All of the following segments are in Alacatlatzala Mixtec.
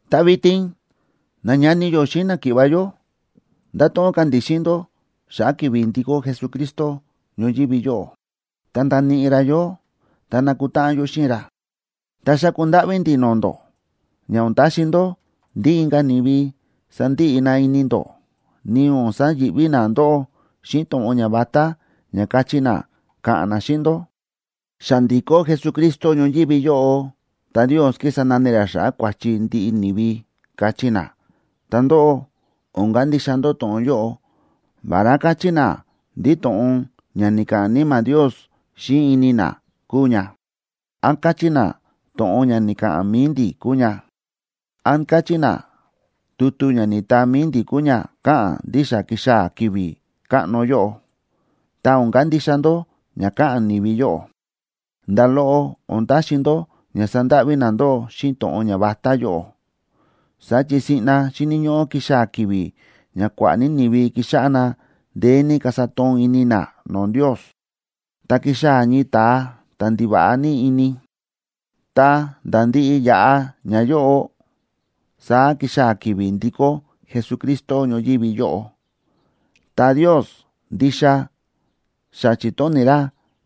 Ta vitin, nañani yó xíꞌin náki̱ꞌva̱ yó, ndato̱ꞌon ka̱ ndi̱ xíꞌin ndó xa̱ꞌa̱ ki̱vi̱ ndikó Jesucristo ñoyívi yóꞌo, ta ndaníꞌi ra yó, ta nakutáꞌan yó xíꞌin ra. Ta xáku ndáꞌví ndi̱ no̱o̱ ndó ña o̱n taxi ndó ndí inka̱ ni̱vi sandiꞌi na ini ndó, ni o̱n sayi̱ꞌví na ndóꞌó xíꞌin to̱ꞌon ñavatá ña káchí na, káꞌa̱n na xíꞌin ndó: “Xa ndi̱kó Jesucristo ñoyívi yóꞌo ta Ndios kísa nani ra kua̱chi ndiꞌi ni̱vi”, káchí na. Ta ndóꞌó, o̱n kandixa ndó to̱ꞌon yóꞌo, vará káchí na ndí to̱ꞌon ña ni̱ka̱ꞌa̱n Níma̱ Ndios xíꞌin ini na kúu ña, án káchí na to̱ꞌon ña ni̱ka̱ꞌa̱n mi̱i ndi̱ kúu ña, án káchí na tutu ña ni̱taa mi̱i ndi̱ kúu ña káꞌa̱n ndí xa ki̱xaa̱ ki̱vi̱ káꞌno yóꞌo, ta o̱n kandixa ndó ña káꞌa̱n ni̱vi yóꞌo. Nda̱ loꞌo o̱n taxi ndó ña sandáꞌví na ndóꞌó xíꞌin to̱ꞌon ñavatá yóꞌo, saá chi siꞌna xíni̱ ñóꞌó kixaa̱ ki̱vi̱ ña kua̱ꞌa̱ ní ni̱vi kixáꞌá na ndeé ní kasa toon ini na no̱o̱ Ndios, ta kixaa̱ ñii ta̱a ta̱ ndiva̱ꞌa ní ini, ta̱nda̱ ndiꞌi yaꞌa ñayóꞌo, saá kixaa̱ ki̱vi̱ ndikó Jesucristo ñoyívi yóꞌo. Ta Ndios ndixa xa chi̱tóni̱ ra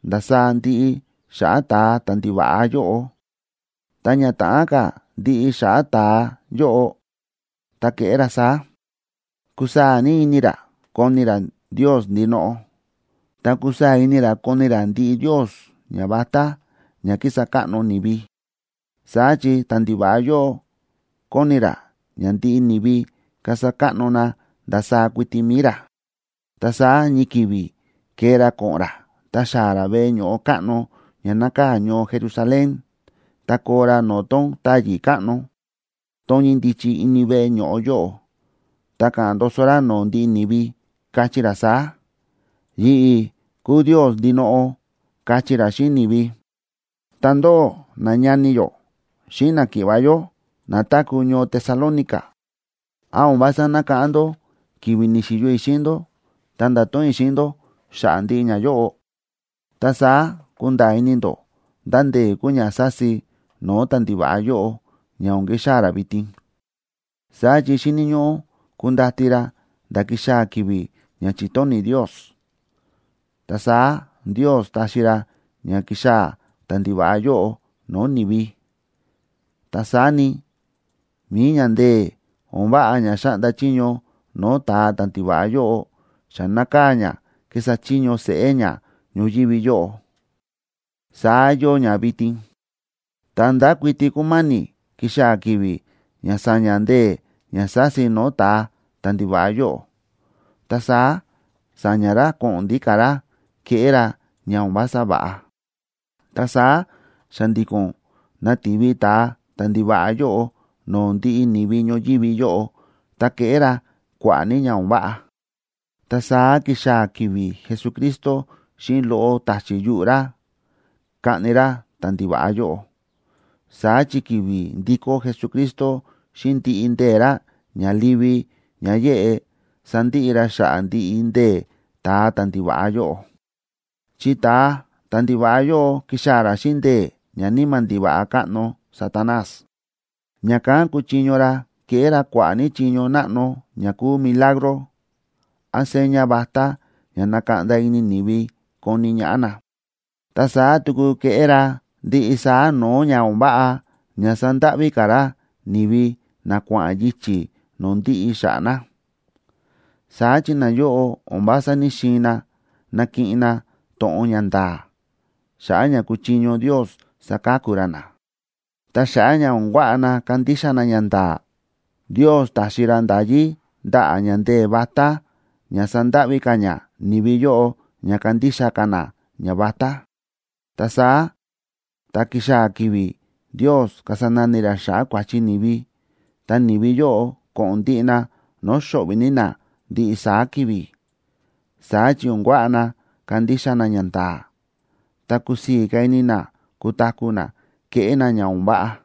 ndasaá ndiꞌi xa̱ꞌa̱ ta̱a ta̱ndiva̱ꞌa yóꞌo. Ta ña ta̱ꞌán ka̱ ndiꞌi xa̱ꞌa̱ ta̱a yóꞌo, ta keꞌé ra saá: kusaa̱ ní ini ra koni ra Ndios ndinoꞌo, ta kusaa̱ ini ra koni ra ndiꞌi ndios ñavatá ña kísa káꞌno ni̱vi, saá chi ta̱ndiva̱ꞌa yóꞌo koni ra ña ndiꞌi ni̱vi kasa káꞌno na ndasaá kuiti mi̱i ra. Ta saá ñii ki̱vi̱ kee ra ko̱ꞌo̱n ra ta xaa̱ ra veꞌe ño̱ꞌo káꞌno ña nákaa̱ ñoo Jerusalén, ta koo ra no̱o̱ tón táyi̱ káꞌno, tón ñíndichi ini veꞌe ño̱ꞌo yóꞌo, ta ka̱ꞌa̱n ndoso ra no̱o̱ ndiꞌi ni̱vi, kachí ra saá: “Yi̱ꞌi̱ kúu Ndios ndinoꞌo”, kachí ra xíꞌin ni̱vi. Ta ndóꞌó, nañani yó xíꞌin náki̱ꞌva̱ yó na táku̱ ñoo Tesalónica, ¿án o̱n vása nákáꞌán ndó ki̱vi̱ ni̱xi̱yo i̱ xíꞌin ndó, ta nda̱to̱ꞌon i̱ xíꞌin ndó xa̱ꞌa̱ ndiꞌi ñayóꞌo? Ta saá kúnda̱a̱ ini ndó ndá ndee̱ kúu ña sási no̱o̱ ta̱ndiva̱ꞌa yóꞌo ña o̱n kixaa̱ ra vitin. Saá chi xíni̱ ñóꞌó kundati ra nda̱ kixaa̱ ki̱vi̱ ña chi̱tóni̱ Ndios, ta saá Ndios táxi ra ña kixaa̱ ta̱ndiva̱ꞌa yóꞌo no̱o̱ ni̱vi. Ta saá ni, mi̱i ña ndee̱ o̱n váꞌa ña xáꞌnda chiño no̱o̱ ta̱a ta̱ndiva̱ꞌa yóꞌo xa nákaa̱ ña kísa chiño seꞌé ña ñoyívi yóꞌo. Saá yóo ña vitin, ta ndákuiti kúma̱ni̱ kixaa̱ ki̱vi̱ ña sa̱ña̱ ndee̱ ña sási no̱o̱ ta̱a ta̱ndiva̱ꞌa yóꞌo, ta saá sa̱ña̱ ra ko̱ꞌo̱n ndíka̱ ra keꞌé ra ña o̱n vása va̱ꞌa. Ta saá xa̱ndi̱ko̱n nativi ta̱a ta̱ndiva̱ꞌa yóꞌo no̱o̱ ndiꞌi ni̱vi ñoyívi yóꞌo ta keꞌé ra kua̱ꞌa̱ ní ña o̱n váꞌa. Ta saá kixaa̱ ki̱vi̱ Jesucristo, xíꞌin loꞌo ta̱chi̱ yuꞌu̱ ra, kaꞌni ra ta̱ndiva̱ꞌa yóꞌo. Saá chi ki̱vi̱ ndikó Jesucristo xíꞌin ndiꞌi ndee̱ ra ña livi ña yéꞌe, sandiꞌi ra xa̱ꞌa̱ ndiꞌi ndee̱ ta̱a ta̱ndiva̱ꞌa yóꞌo. Chi ta̱a ta̱ndiva̱ꞌa yóꞌo kixaa̱ ra xíꞌin ndee̱ ñaníma̱ ndiva̱ꞌa káꞌno Satanás, ña̱kán kuchiño ra keꞌé ra kua̱ꞌa̱ ní chiño náꞌno ña kúu milagro án seña vatá ña nakaꞌnda ini ni̱vi koni ñaꞌá na. Ta saá tuku keꞌé ra ndiꞌi saá no̱o̱ ña o̱n váꞌa ña sandáꞌví ka̱ ra ni̱vi na kua̱ꞌa̱n yichi̱ no̱o̱ ndiꞌi xa̱ꞌa̱ na. Saá chi nayóꞌo o̱n vása ní‑xiin na nakiꞌin na to̱ꞌon ña nda̱a̱, xa̱ꞌa̱ ña kuchiño Ndios saka̱ku ra na. Ta xa̱ꞌa̱ ña o̱n kuaꞌa na kandixa na ñanda̱a̱, Ndios taxi ra nda̱yí ndaꞌa̱ ña ndee̱ vatá ña sandáꞌví ka̱ ña ni̱vi yóꞌo ña kandixa ka̱ na ñavatá. Ta saá tá kixaa̱ ki̱vi̱ Ndios kasa nani ra xa̱ꞌa̱ kua̱chi ni̱vi, ta ni̱vi yóꞌo ko̱ꞌo̱n ndiꞌi na no̱o̱ xo̱ꞌvi̱ ní na ndiꞌi saá ki̱vi̱. Saá chi o̱n kuaꞌa na kandixa na ñanda̱a̱, ta kusii̱ ní ka̱ ini na kutaku̱ na kéꞌé na ña o̱n váꞌa.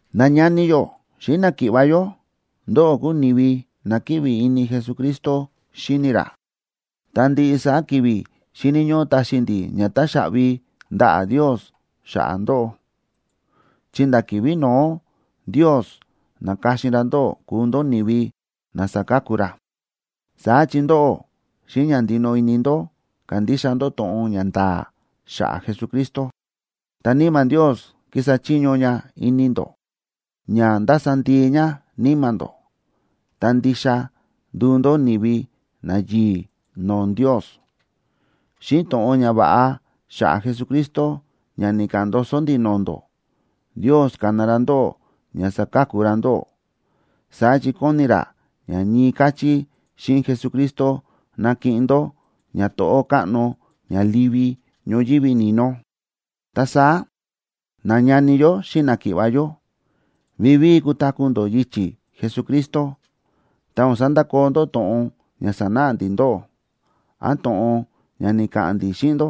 Nañani yó xíꞌin náki̱ꞌva̱ yó, ndóꞌó kúu ni̱vi na kíꞌvi ini Jesucristo xíni ra. Ta ndiꞌi saá ki̱vi̱ xíni̱ ñóꞌó taxi ndi̱ ña táxaꞌvi ndaꞌa̱ Ndios xa̱ꞌa̱ ndóꞌó, chi nda̱ ki̱vi̱ no̱ó Ndios na̱ka̱xin ra ndóꞌó kuu ndó ni̱vi na saka̱ku ra. Saá chi ndóꞌó, xíꞌin ña ndinoꞌo ini ndó ka̱ndixa ndó to̱ꞌon ña nda̱a̱ xa̱ꞌa̱ Jesucristo, ta Níma̱ Ndios kísa chiño ña ini ndó, ña ndasa ndii ña níma̱ ndó, ta ndixa nduu ndó ni̱vi nayi̱i̱ no̱o̱ Ndios. Xíꞌin to̱ꞌon ñava̱ꞌa xa̱ꞌa̱ Jesucristo ña ni̱ka̱ꞌa̱n ndoso ndi̱ no̱o̱ ndó, Ndios ka̱na ra ndóꞌó ña saka̱ku ra ndóꞌó. Saá chi kóni ra ña ñii káchí xíꞌin Jesucristo nakiꞌin ndó ñato̱ꞌó káꞌno ña livi ñoyívi ni̱no. Ta saá, nañani yó xíꞌin náki̱ꞌva̱ yó, vivíi kutaku̱ ndó yichi̱ Jesucristo, ta o̱n sandakoo ndó to̱ꞌon ña sa̱náꞌa ndi̱ ndóꞌó. Án to̱ꞌon ña ni̱ka̱ꞌa̱n ndi̱ xíꞌin ndó,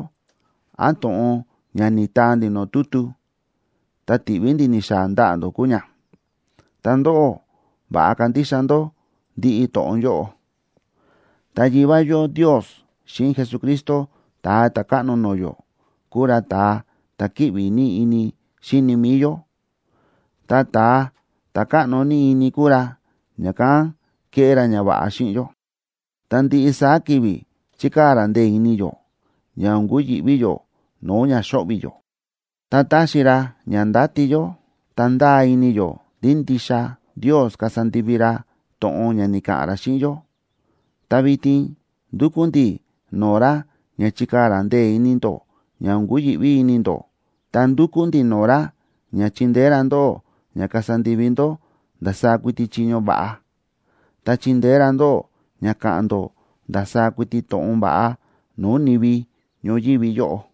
án to̱ꞌon ña ni̱taa ndi̱ no̱o̱ tutu, ta ti̱ꞌví ndi̱ ni̱xaa̱ ndaꞌa̱ ndó kúu ña, ta ndóꞌó, va̱ꞌa kandixa ndó ndiꞌi to̱ꞌon yóꞌo. Ta Yivá yó Ndios xíꞌin Jesucristo, Ta̱a Ta̱káꞌno no̱o̱ yó, kúu ra ta̱a ta̱ kíꞌvi ní ini xíni mi̱i yó, ta ta̱a ta̱ káꞌno ní ini kúu ra, ña̱kán kéꞌé ra ñava̱ꞌa xíꞌin yó, ta ndiꞌi saá ki̱vi̱ chíkaa̱ ra ndee̱ ini yó ña o̱n kuyi̱ꞌví yó no̱o̱ ña xo̱ꞌvi̱ yó. Ta táxi ra ña ndáti yó ta ndáa ini yó ndí ndixa Ndios kasa ndivi ra to̱ꞌon ña ni̱ka̱ꞌa̱n ra xíꞌin yó. Ta vitin ndúkú ndi̱ no̱o̱ ra ña chikaa̱ ra ndee̱ ini ndó ña o̱n kuyi̱ꞌví ini ndó, ta ndúkú ndi̱ no̱o̱ ra ña chindeé ra ndóꞌó ña kasa ndivi ndó ndasaá kuiti chiño va̱ꞌa, ta chindeé ra ndóꞌó ña ka̱ꞌa̱n ndó ndasaá kuiti to̱ꞌon va̱ꞌa no̱o̱ ni̱vi ñoyívi yóꞌo.